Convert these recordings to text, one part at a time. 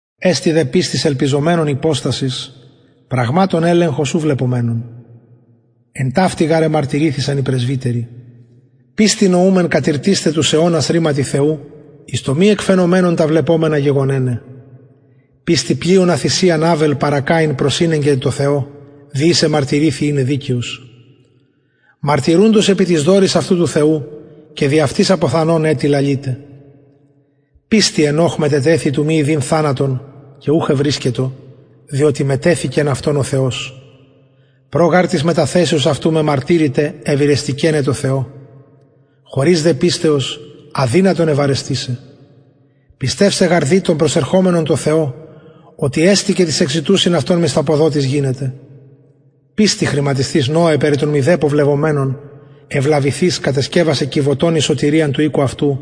εστιν δε πιστις ελπιζομενων υποστασις πραγματων ελεγχος ου βλεπομενων εν ταυτη γαρ εμαρτυρηθησαν οι πρεσβυτεροι πιστει νοουμεν κατηρτισθαι τους αιωνας ρηματι θεου εις το μη εκ φαινομενων τα βλεπομενα γεγονεναι πιστει πλειονα θυσιαν αβελ παρα καιν προσηνεγκεν τω θεω δι ης εμαρτυρηθη ειναι δικαιος μαρτυρουντος επι τοις δωροις αυτου του θεου και δι αυτης αποθανων ετι λαλειται πιστει ενωχ μετετεθη του μη ιδειν θανατον και ουχ ευρισκετο διοτι μετεθηκεν αυτον ο θεος προ γαρ της μεταθεσεως αυτου μεμαρτυρηται ευηρεστηκεναι τω θεω χωρις δε πιστεως αδυνατον ευαρεστησαι πιστευσαι γαρ δει τον προσερχομενον τω θεω οτι εστιν και τοις εκζητουσιν αυτον μισθαποδοτης γινεται πιστει χρηματισθεις νωε περι των μηδεπω βλεπομενων ευλαβηθεις κατεσκευασεν κιβωτον εις σωτηριαν του οικου αυτου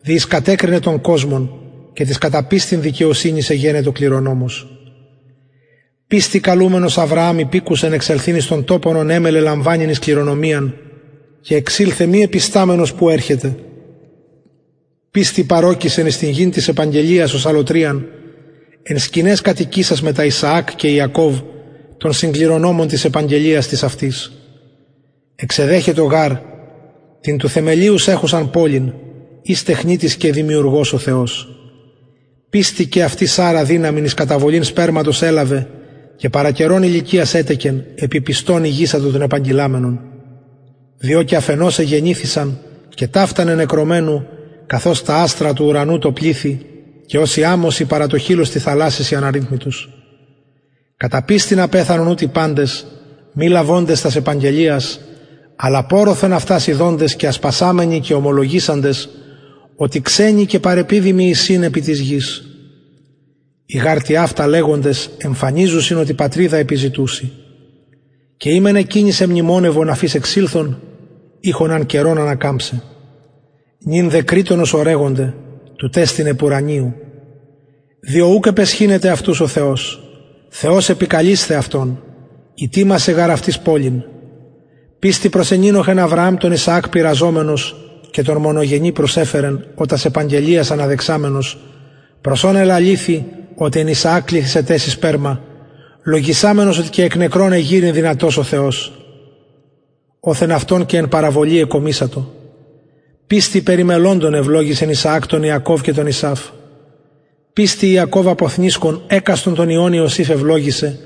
δι ης κατεκρινεν τον κοσμον και της κατα πιστιν δικαιοσυνης εγενετο κληρονομος πιστει καλουμενος αβρααμ υπηκουσεν εξελθειν εις τον τοπον ον ημελλεν λαμβανειν εις κληρονομιαν και εξηλθεν μη επισταμενος που ερχεται πιστει παρωκησεν εις γην της επαγγελιας ως αλλοτριαν εν σκηναις κατοικησας μετα ισαακ και ιακωβ των συγκληρονομων της επαγγελιας της αυτης εξεδεχετο γαρ την τους θεμελιους εχουσαν πολιν ης τεχνιτης και δημιουργος ο θεος πιστει και αυτη σαρρα δυναμιν εις καταβολην σπερματος ελαβεν και παρα καιρον ηλικιας ετεκεν επει πιστον ηγησατο τον επαγγειλαμενον διο και αφ ενος εγεννηθησαν και ταυτα νενεκρωμενου καθως τα αστρα του ουρανου τω πληθει και ως η αμμος η παρα το χειλος της θαλασσης η αναριθμητος κατα πιστιν απεθανον ουτοι παντες μη λαβοντες τας επαγγελιας αλλα πορρωθεν αυτας ιδοντες και ασπασαμενοι και ομολογησαντες οτι ξενοι και παρεπιδημοι εισιν επι της γης οι γαρ τοιαυτα λεγοντες εμφανιζουσιν οτι πατριδα επιζητουσιν και ει μεν εκεινης εμνημονευον αφ ης εξηλθον ειχον αν καιρον ανακαμψαι νυν δε κρειττονος ορεγονται τουτ εστιν επουρανιου διο ουκ επαισχυνεται αυτους ο θεος θεος επικαλεισθαι αυτων ητοιμασεν γαρ αυτοις πολιν πιστει προσενηνοχεν αβρααμ τον ισαακ πειραζομενος και τον μονογενη προσεφερεν ο τας επαγγελιας αναδεξαμενος προς ον ελαληθη οτι εν ισαακ κληθησεται σοι σπερμα λογισαμενος οτι και εκ νεκρων εγειρειν δυνατος ο θεος οθεν αυτον και εν παραβολη εκομισατο πιστει περι μελλοντων ευλογησεν ισαακ τον ιακωβ και τον ησαυ πιστει ιακωβ αποθνησκων εκαστον των υιων ιωσηφ ευλογησεν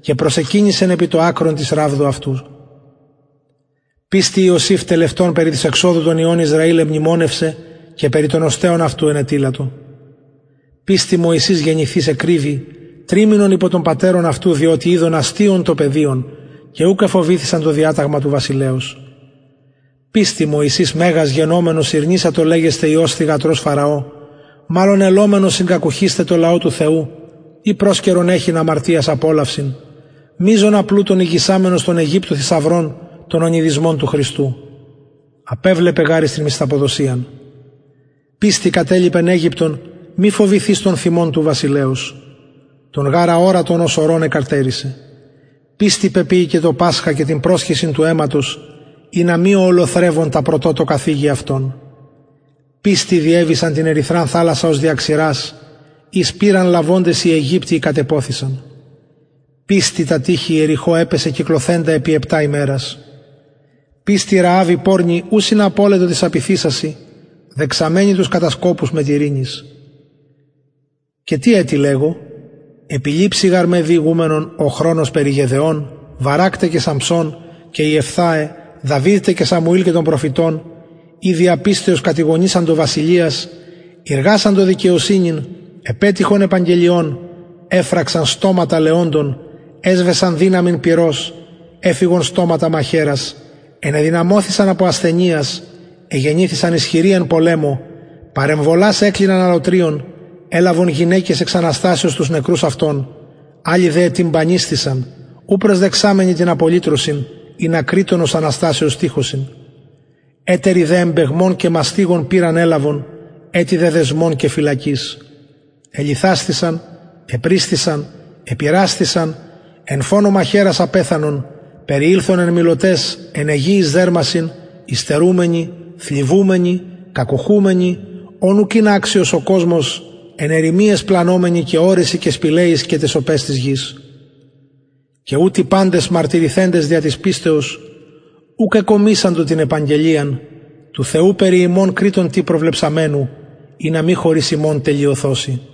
και προσεκυνησεν επι το ακρον της ραβδου αυτου πιστει ιωσηφ τελευτων περι της εξοδου των υιων ισραηλ εμνημονευσεν και περι των οστεων αυτου ενετειλατο πιστει μωυσης γεννηθεις εκρυβη τριμηνον υπο των πατερων αυτου διοτι ειδον αστειον το παιδιον και ουκ εφοβηθησαν το διαταγμα του βασιλεως πιστει μωυσης μεγας γενομενος ηρνησατο λεγεσθαι υιος θυγατρος φαραω μαλλον ελομενος συγκακουχεισθαι τω λαω του θεου η προσκαιρον εχειν αμαρτιας απολαυσιν μειζονα πλουτον ηγησαμενος των αιγυπτου θησαυρων τον ονειδισμον του χριστου απεβλεπεν γαρ εις την μισθαποδοσιαν πιστει κατελιπεν αιγυπτον μη φοβηθεις τον θυμον του βασιλεως τον γαρ αορατον ως ορων εκαρτερησεν πιστει πεποιηκεν το πασχα και την προσχυσιν του αιματος ινα μη ο ολοθρευων τα πρωτοτοκα θιγη αυτων πιστει διεβησαν την ερυθραν θαλασσαν ως δια ξηρας ης πειραν λαβοντες οι αιγυπτιοι κατεποθησαν πιστει τα τειχη ιεριχω επεσεν κυκλωθεντα επι επτα ημερας πιστει ρααβ η πορνη ου συναπωλετο τοις απειθησασιν δεξαμενη τους κατασκοπους μετ ειρηνης και τι ετι λεγω επιλειψει γαρ με διηγουμενον ο χρονος περι γεδεων βαρακ τε και σαμψων και ιεφθαε δαυιδ τε και σαμουηλ και των προφητων οι δια πιστεως κατηγωνισαντο βασιλειας ειργασαντο δικαιοσυνην επετυχον επαγγελιων εφραξαν στοματα λεοντων εσβεσαν δυναμιν πυρος εφυγον στοματα μαχαιρας ενεδυναμωθησαν απο ασθενειας εγενηθησαν ισχυροι εν πολεμω παρεμβολας εκλιναν αλλοτριων ελαβον γυναικες εξ αναστασεως τους νεκρους αυτων αλλοι δε ετυμπανισθησαν ου προσδεξαμενοι την απολυτρωσιν ινα κρειττονος αναστασεως τυχωσιν ετεροι δε εμπαιγμων και μαστιγων πειραν ελαβον ετι δε δεσμων και φυλακης ελιθασθησαν επρισθησαν επειρασθησαν εν φονω μαχαιρας απεθανον περιηλθον εν μηλωταις εν αιγειοις δερμασιν υστερουμενοι θλιβομενοι κακουχουμενοι ων ουκ ην αξιος ο κοσμος εν ερημιαις πλανωμενοι και ορεσιν και σπηλαιοις και ταις οπαις της γης και ουτοι παντες μαρτυρηθεντες δια της πιστεως ουκ εκομισαντο την επαγγελιαν του θεου περι ημων κρειττον τι προβλεψαμενου ινα μη χωρις ημων τελειωθωσιν